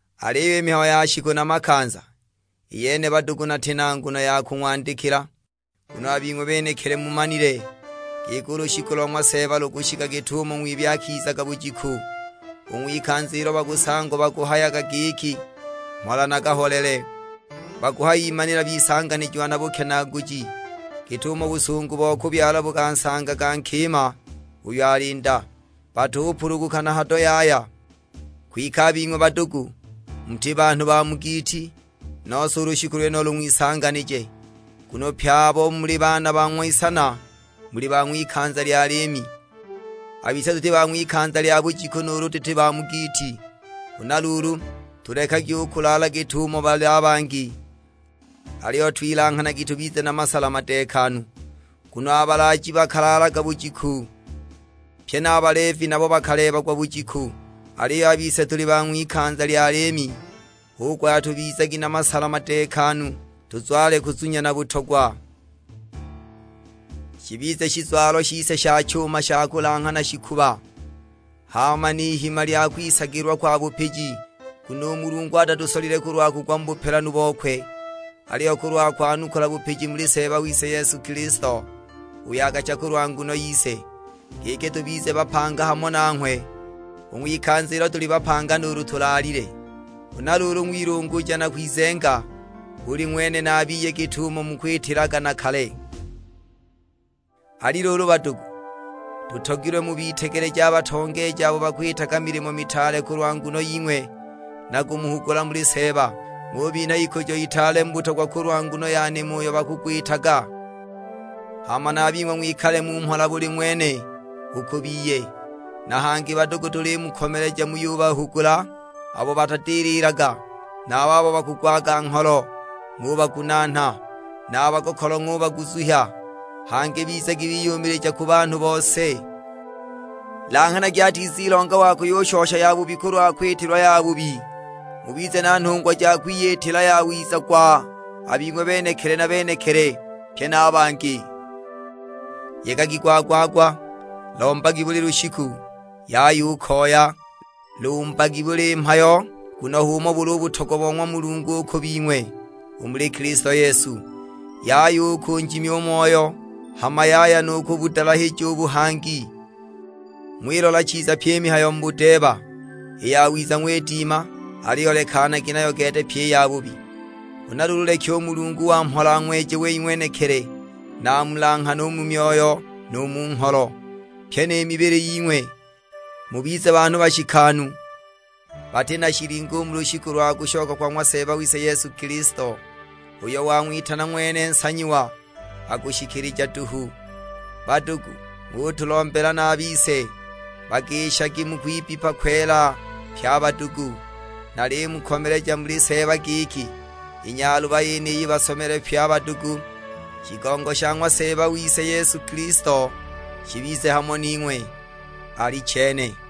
Aliyo i mihayo ya shiku na makanza, i yene badugu nati na nguno ya kung'wandikila. Nguno a bing'we benekili mumanile, giki u lushiku lo ng'wa Seeba lukushika git'umo ng'wibi akizaga bujiku. U ng'wikanza ilo bakusangwa bakuhayaga giki mhola na kaholele, bakuhayimanila bisanganijiwa na bukenaaguji, git'umo busungu bo kubyala bukansangaga nkima uyo ali nda; batupuluguka na hado yaya! Kwike a bing'we badugu, muti banhu ba mu giiti, nose u lushiku lwenulo lung'wisanganije. Nguno pye abo muli baana ba ng'wisana muli ba ng'wikanza lya liimi. A bise tuti ba ng'wikanza lya bujiku nuulu tuti ba mu giiti. Huna luulu, tulekagi u kulaala git'umo bali a bangi, aliyo twilanghanagi tubize na masala madeekanu. Nguno a balaaji bakalaalaga bujiku, pye na a baleevi nabo bakaleebagwa bujiku. Aliyo a bise tuli ba ng'wikanza lya liimi, hu kuhaya tubizagi na masala madeekanu, tuzwale kuzunya na butogwa, shibize shizwalo shise sha chuma sha kulanghana shikuba; hama n'ihima lya kwisagilwa kwa bupiji. Nguno u Mulungu atatusolile kulwa kugwa mu bupelanu bokwe, aliyo kulwa kwanukula bupiji muli Seeba wise Yesu Kilisto, uyo akacha kulwa nguno yise; giki tubize bapanga hamo nanghwe, u ng'wikanza ilo tuli bapanga nuulu tulaalile. Huna luulu ng'wilunguja na kwizenga, buli ng'wene na a biye git'umo mukwitilaga na kale. Ali luulu badugu, tutogilwe mubitegeleje a batongeeji abo bakwitaga milimo mitaale kulwa nguno ying'we, na kumuhugula muli Seeba. Ng'ubinha ikujo itaale mu butogwa kulwa nguno ya nimo uyo bakugwitaga, hama na a bing'we ng'wikale mu mhola buli ng'wene u ku biye. Na hangi badugu tulimukomeleja muyubahugula abo batadililaga; na a babo bakugwaga ngholo ng'ubagunaana, na a bagokolo ng'ubaguzuhya. Hangi bizagi biyumilija ku banhu bose. Langhanagi atizilonga wa kuyushosha yabubi kulwa kwitilwa yabubi, mubize na nhungwa ja kwiyitila yawiza gwa a bing'we benekili na benekili; pye na a bangi. Yegagi gwa-gwa-gwa. Lombagi buli lushiku, yaya u koya. Lumbagi mu buli mhayo, nguno h'umo buli u butogwa bo ng'wa Mulungu u ku bing'we, u muli Kilisto Yesu. Yaya u kunjimya u Moyo; hama yaya nu kubudalahija u buhangi. Ng'wilola chiza pyi i mihayo mu budeeba, i yawiza ng'widima; aliyo lekanagi nayo gete pyi i yabubi. Huna luulu leki u Mulungu wa mhola ang'weje wei ng'wenekili, na amulanghane u mu myoyo nu mu ngholo, pyi ni mibili ying'we. Mubize banhu bashikanu, bati na shilingo u mu lushiku lwa kushoka kwa ng'wa Seeba wise Yesu Kilisto. Uyo wang'witana ng'wene nsanyiwa, akushikilija duhu. Badugu, ng'utulombela na a bise. Bagishagi mu kwibbipa kwela pye a badugu. Nalimukomeleja muli Seeba giki, i nyaluba yeniyi basomelwe pye a badugu. Shigongo sha ng'wa Seeba wise Yesu Kilisto shibize hamo ning'we: Alichene.